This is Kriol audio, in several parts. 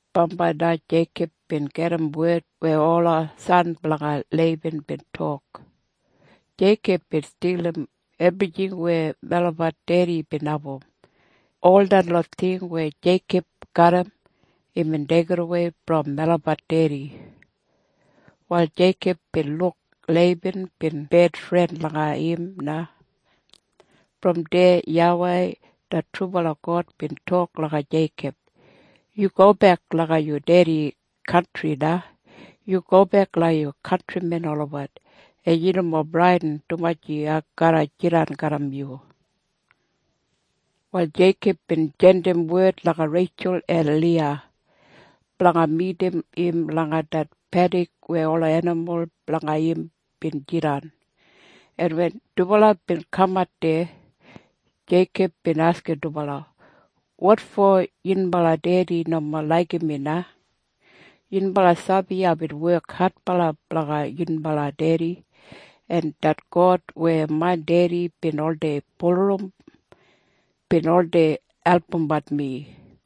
Bambai na Jeikob bin gedim wed weya ola san blanga Leiban bin tok, “Jeikob bin stilim ebrijing weya melabat dedi bin abum. Ol detlot ting weya Jeikob garram, imbin deigidawei brom melabat dedi.” Wal Jeikob bin luk Leiban bin bedfren langa im na. Brom deya YAWEI det trubala God bin tok langa Jeikob, “Yu gobek langa yu dedi kantri na. Yu gobek langa yu kantrimen olabat, en yu nomo bradin, dumaji ai garra jidan garram yu.” Wal Jeikob bin jandim wed langa Reitjul en Liya blanga midim im langa det pedik weya ola enimul blanga im bin jidan, en wen dubala bin kamat deya, Jeikob bin askim dubala, “Wotfo yunbala dedi nomo laigim mi na? Yunbala sabi aibin wek adbala blanga yunbala dedi. En det God weya main dedi bin oldei bulurrum, bin oldei albumbat mi.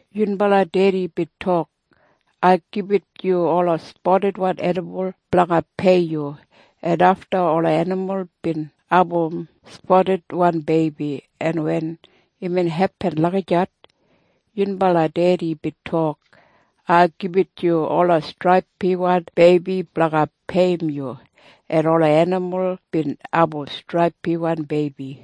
Yunbala dedi bin tok, ‘Ai gibit yu ola spadidwan enimul blanga peiyim yu.’ En afta ola enimul bin abum spadidwan beibi, en wen imbin hepin lagijat, yunbala dedi bin tok, ‘Ai gibit yu ola straipiwan beibi blanga peiyim yu.’ En ola enimul bin abum straipiwan beibi.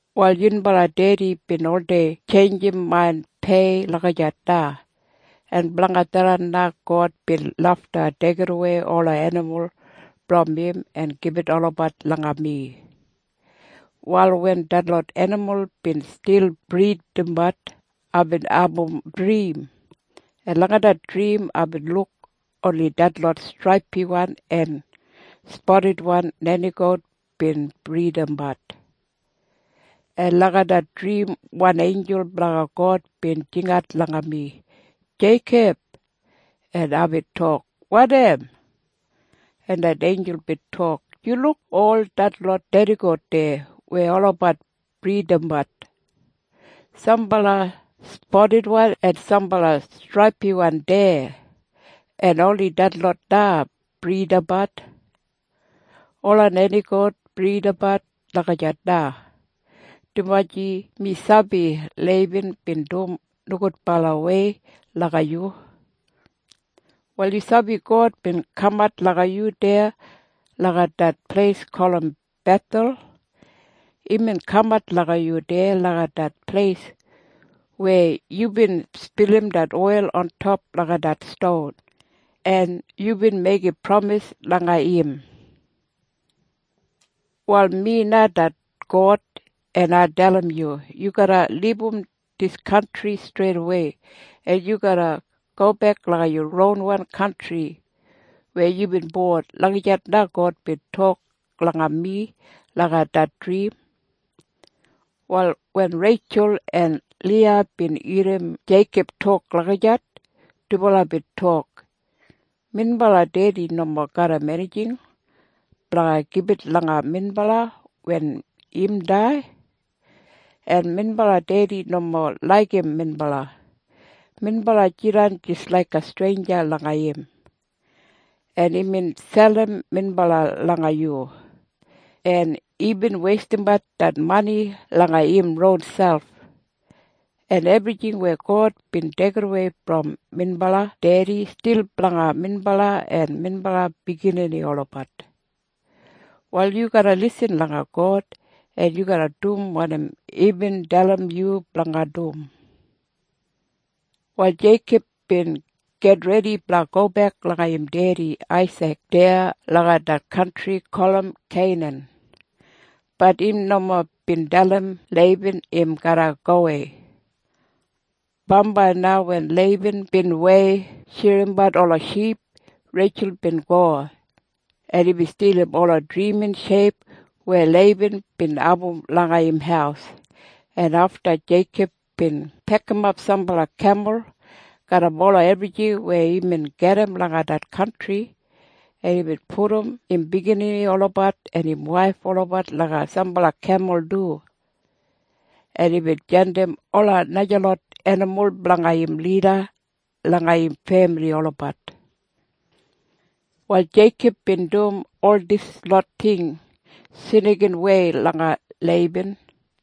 “Wal yunbala dedi bin oldei tjeinjim main pei lagijat na. En blanga tharran na God bin lafta deigidawei ola enimul brom im en gibit olabat langa mi. “Wal wen detlot enimul bin stil bridabat, aibin abum drim, en langa det drim aibin luk oni detlot straipiwan en spadidwan nenigout bin bridabat. En langa det drim wan einjul blanga God bin jingat langa mi, ‘Jeikob!’ En aibin tok, ‘Wanim?’ “En det einjul bin tok, ‘Yu luk ol detlot nenigout deya weya olabat bridabat? Sambala spadidwan en sambala straipiwan deya. En oni detlot na bridabat. Ola nenigout bridabat lagijat na, dumaji mi sabi Leiban bin dum nogudbalawei langa yu. “‘Wal yu sabi God bin kamat langa yu deya langa det pleis gulum Bethel. Imbin kamat langa yu deya langa det pleis weya yubin spilim det oil ontop langa det ston, en yubin meigim pramis langa im. “‘Wal mi na det God. En ai dalim yu. Yu garra libum dis kantri streidawei, en yu garra gobek langa yu ronwan kantri weya yubin bon.’ Lagijat na God bin tok langa mi langa det drim.” Wal wen Reitjul en Liya bin irrim Jeikob tok lagijat, dubala bin tok, “Minbala dedi nomo garram enijing blanga gibit langa minbala wen im dai. En minbala dedi nomo laigim minbala. Minbala jidan jis laiga streinja langa im, en imbin selim minbala langa yu, en imbin weistimbat det mani langa im ronselp. En ebrijing weya God bin deigidawei brom minbala dedi stil blanga minbala en minbala biginini olabat. Wal yu garra lisin langa God, en yu garra dum wanim imbin dalim yu blanga dum.” Wal Jeikob bin gitredi blanga gobek langa im dedi Aisik deya langa det kantri gulum Keinan. Bat im nomo bin dalim Leiban im garra gowei. Bambai na wen Leiban bin wei shirimbat ola ship, Reitjul bin go, en imbin stilim ola drimin sheip weya Leiban bin abum langa im haus, en afta Jeikob bin pekimap sambala kemul garram ola ebrijing weya imbin gedim langa det kantri, en imbin pudum im biginini olabat en im waif olabat langa sambala kemul du, en imbin jandim ola najalot enimul blanga im lida langa im femili olabat. Wal Jeikob bin dum ol dislot ting snikinwei langa Leiban,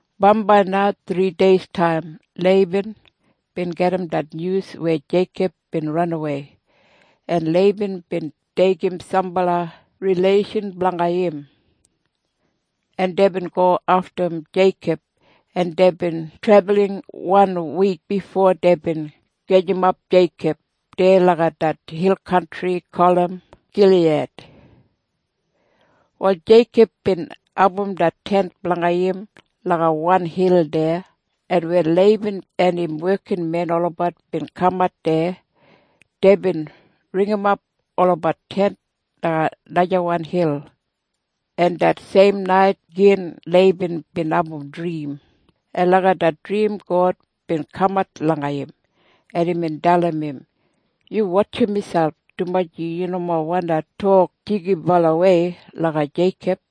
Bambai na thrideistaim Leiban bin gedim det nyus weya Jeikob bin ranawei, en Leiban bin deigim sambala rileishan blanga im, en deibin go aftum Jeikob, en deibin trebulin wan wik bifo deibin gajimap Jeikob deya langa det hil kantri gulum Giliyad. Wal Jeikob bin abum det tent blanga im langa wan hil deya, en wen Leiban en im wekinmen olabat bin kamat deya, deibin ringimap olabat tent langa najawan hil, en det seim nait gin Leiban bin abum drim, en langa det drim God bin kamat langa im, en imbin dalim im, “Yu wotjim miselp, dumaji yu nomo wandi tok jigibalawei langa Jeikob.”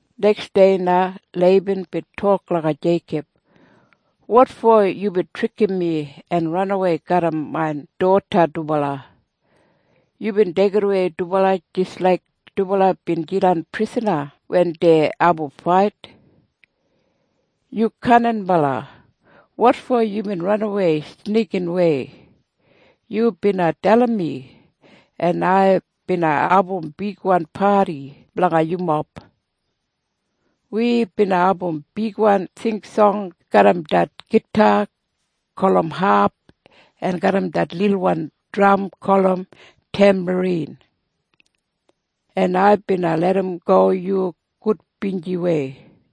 Neksdei na Leiban bin tok langa Jeikob, “Wotfo yubin trikim mi en ranawei garram main doda dubala? Yubin deigidawei dubala jis laik dubala bin jidan prisana wen dei abum fait. Yu kaninbala. Wotfo yubin ranawei snikinwei? Yu bina dalim mi, en ai bina abum bigwan padi blanga yumob. Wi bina abum bigwan singsong garram det gita gulum hap en garram det lilwan dram gulum tembarin. En ai bina larramgo yu gudbinjiwei.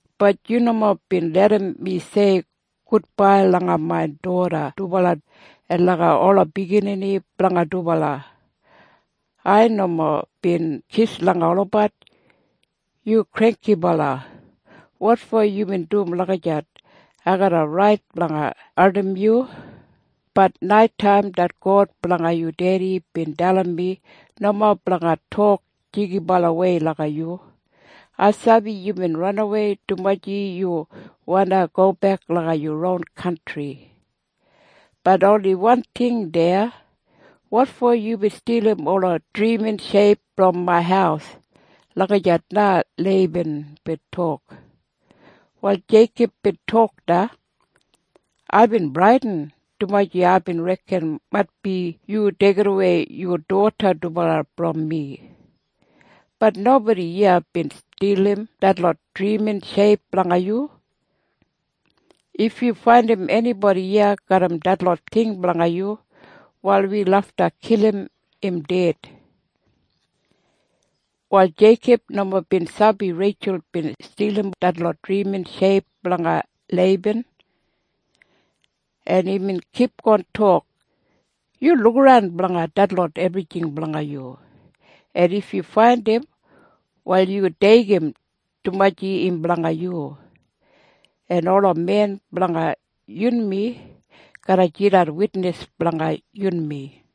“Bat yu nomo bin larram mi tok gudbai langa main doda dubala en langa ola biginini blanga dubala. Ai nomo bin kis langa olabat. Yu granggibala. Wotfo yubin dum lagijat? Ai garram rait blanga ardim yu. Bat naitaim det God blanga yu dedi bin dalim mi nomo blanga tok jigibalawei langa yu. Ai sabi yubin ranawei dumaji yu wandi gobek langa yu ron kantri. Bat oni wan ting deya. Wotfo yubin stilim ola drimin sheip brom main haus?” Lagijat na Leiban bin tok. Wal Jeikob bin tok na, “Aibin bradin, dumaji aibin reken maitbi yu deigidawei yu doda dubala brom mi. Bat nobodi iya bin stilim detlot drimin sheip blanga yu. If yu faindim enibodi iya garram detlot ting blanga yu, wal wi lafta kilim im ded.” Wal Jeikob nomo bin sabi Reitjul bin stilim detlot drimin sheip blanga Leiban. En imbin kipgon tok, “Yu lukaran blanga detlot ebrijing blanga yu. En if yu faindim, wal yu deigim, dumaji im blanga yu. En ola men blanga yunmi garra jidan witnis blanga yunmi.”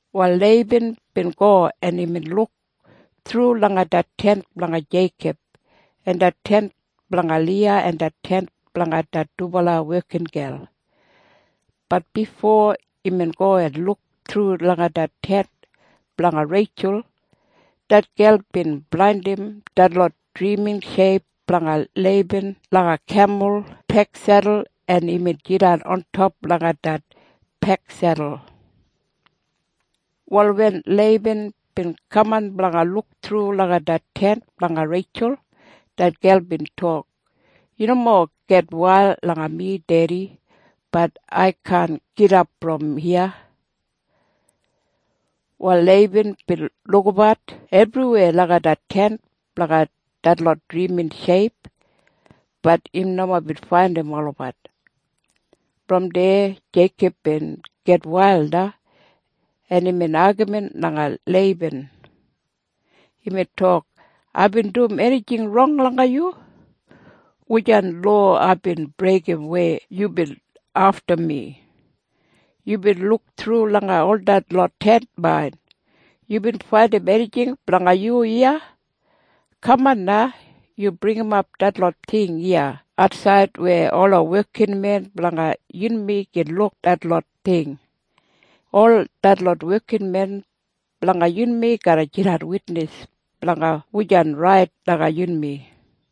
Wal Leiban bin go, en imbin luk thru langa det tent blanga Jeikob en det tent blanga Liya en det tent blanga det dubala wekingel. Bat bifo imbin go en luk thru langa det tent blanga Reitjul, det gel bin blandim detlot drimin sheip blanga Leiban langa kemul peksedul, en imbin jidan ontop langa det peksedul. Wal wen Leiban bin kaman blanga luk thru langa det tent blanga Reitjul, det gel bin tok, “Yu nomo gitwail langa mi, dedi. Bat ai kaan gidap brom iya.” Wal Leiban bin lukabat ebriweya langa det tent blanga detlot drimin sheip. Bat im nomo bin faindim olabat. Brom deya Jeikob bin gitwail na, en imbin agamin langa Leiban. Imbin tok, “Aibin dum enijing rong langa yu? Wujan lowa aibin breigim weya yubin aftum mi? Yubin luk thru langa ol dislot tent main. Yubin faindim enijing blanga yu iya? Kaman na! Yu bringimap detlot ting iya atsaid weya ola wekinmen blanga yunmi gin luk detlot ting. Ol detlot wekinmen blanga yunmi garra jidan witnis blanga wujan rait langa yunmi.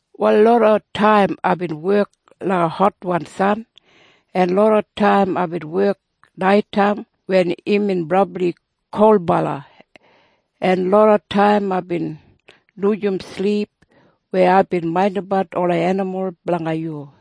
“Wal loda taim aibin wek langa hotwan san. En loda taim aibin wek naitaim wen imbin brabli kolbala. En loda taim aibin lujim silip weya aibin maindimbat ola enimul blanga yu.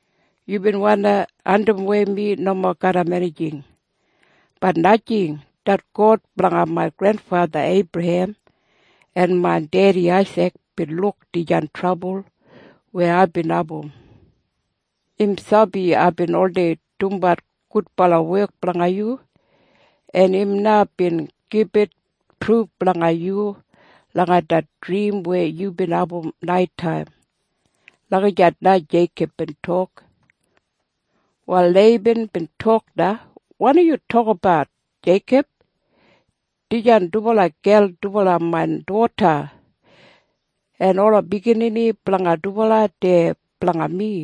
“Yubin wandi andimwei mi nomo garram enijing. Bat najing. Det God blanga main grenfatha Eibrahem en main dedi Aisik bin luk dijan trabul weya aibin abum. Im sabi aibin oldei dumbat gudbala wek blanga yu. En im na bin gibit pruf langa yu langa det drim weya yubin abum naitaim.” Lagijat na Jeikob bin tok. Wal Leiban bin tok na, “Wanim yu tokinabat, Jeikob? Dijan dubala gel dubala main doda. En ola biginini blanga dubala dei blanga mi.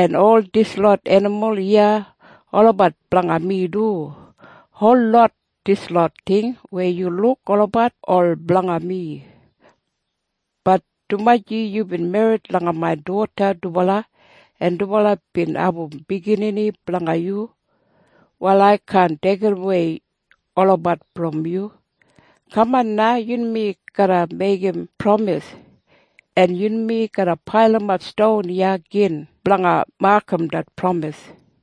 En ol dislot enimul iya olabat blanga mi du. Holot dislot ting weya yu luk olabat ol blanga mi. Bat dumaji yubin merrit langa main doda dubala en dubala bin abum biginini blanga yu, wal ai kaan deigidawei olabat brom yu. Kaman na. Yunmi garra meigim pramis. En yunmi garra pailimap ston iya gin blanga makam det pramis.”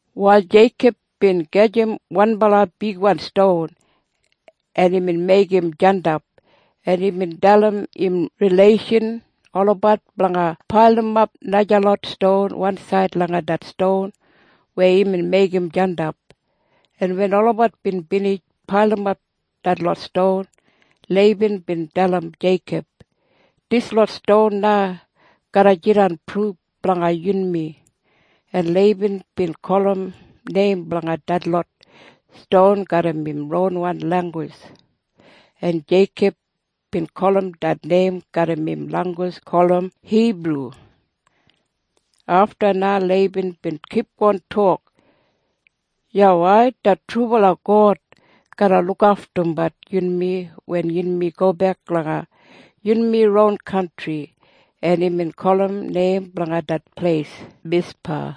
Wal Jeikob bin gajim wanbala bigwan ston, en imbin meigim jandap, en imbin dalim im rileishan olabat blanga pailimap najalot ston wansaid langa det ston weya imbin meigim jandap. En wen olabat bin binij pailimap detlot ston, Leiban bin dalim Jeikob, “Dislot ston na garra jidan pruf blanga yunmi.” En Leiban bin gulum neim blanga detlot ston garram im ronwan langgus en Jeikob bin gulum det neim garram im langgus gulum Hibru. Afta na Leiban bin kipgon tok, “YAWEI det trubala God garra lukaftumbat yunmi wen yunmi gobek langa yunmi ron kantri.” En imbin gulum neim blanga det pleis Mispa.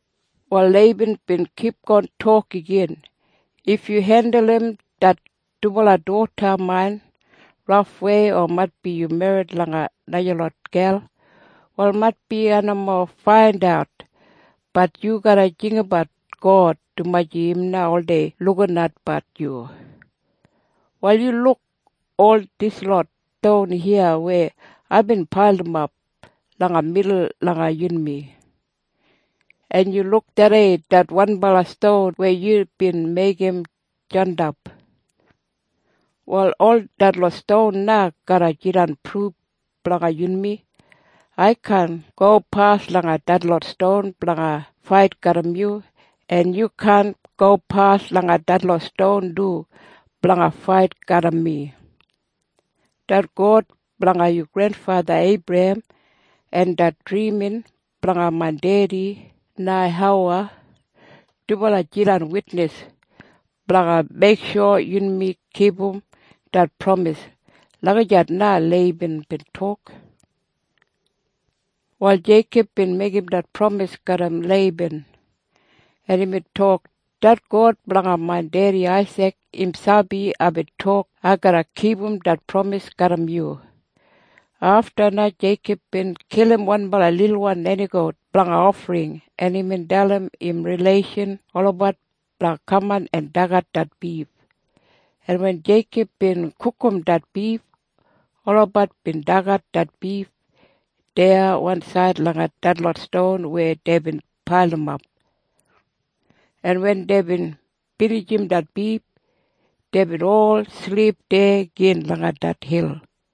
Wal Leiban bin kipgon tok igin, “If yu hendulum det dubala doda main rafwei o maitbi yu merrit langa najalot gel, wal maitbi ai nomo faindat. Bat yu garra jinggabat God, dumaji im na oldei lukinatbat yu. “Wal yu luk ol dislot ston iya weya aibin pailimap langa midul langa yunmi. En yu luk tharrei det wanbala ston weya yubin meigim jandap. Wal ol detlot ston na garra jidan pruf blanga yunmi. Ai kaan gopas langa detlot ston blanga fait garram yu, en yu kaan gopas langa detlot ston du blanga fait garram mi. Det God blanga yu grenfatha Eibrahem en det drimin blanga main dedi Neihowa dubala jidan witnis blanga meiksho yunmi kipum det pramis.” Lagijat na Leiban bin tok. Wal Jeikob bin meigim det pramis garram Leiban, en imbin tok, “Det God blanga main dedi Aisik im sabi aibin tok ai garra kipum dis pramis garram yu.” Afta na Jeikob bin kilim wanbala lilwan nenigout blanga ofring, en imbin dalim im rileishan olabat blanga kaman en dagat det bif, en wen Jeikob bin gugum det bif, olabat bin dagat det bif deya wansaid langa detlot ston weya deibin pailimap, en wen deibin binijim det bif, deibin ol silip deya gin langa det hil.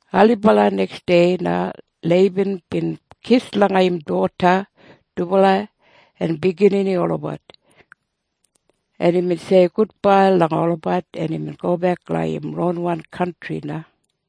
Ailibala neksdei na Leiban bin kis langa im doda dubala en biginini olabat, en imbin sei gudbai langa olabat, en imbin gobek langa im ron kantri na.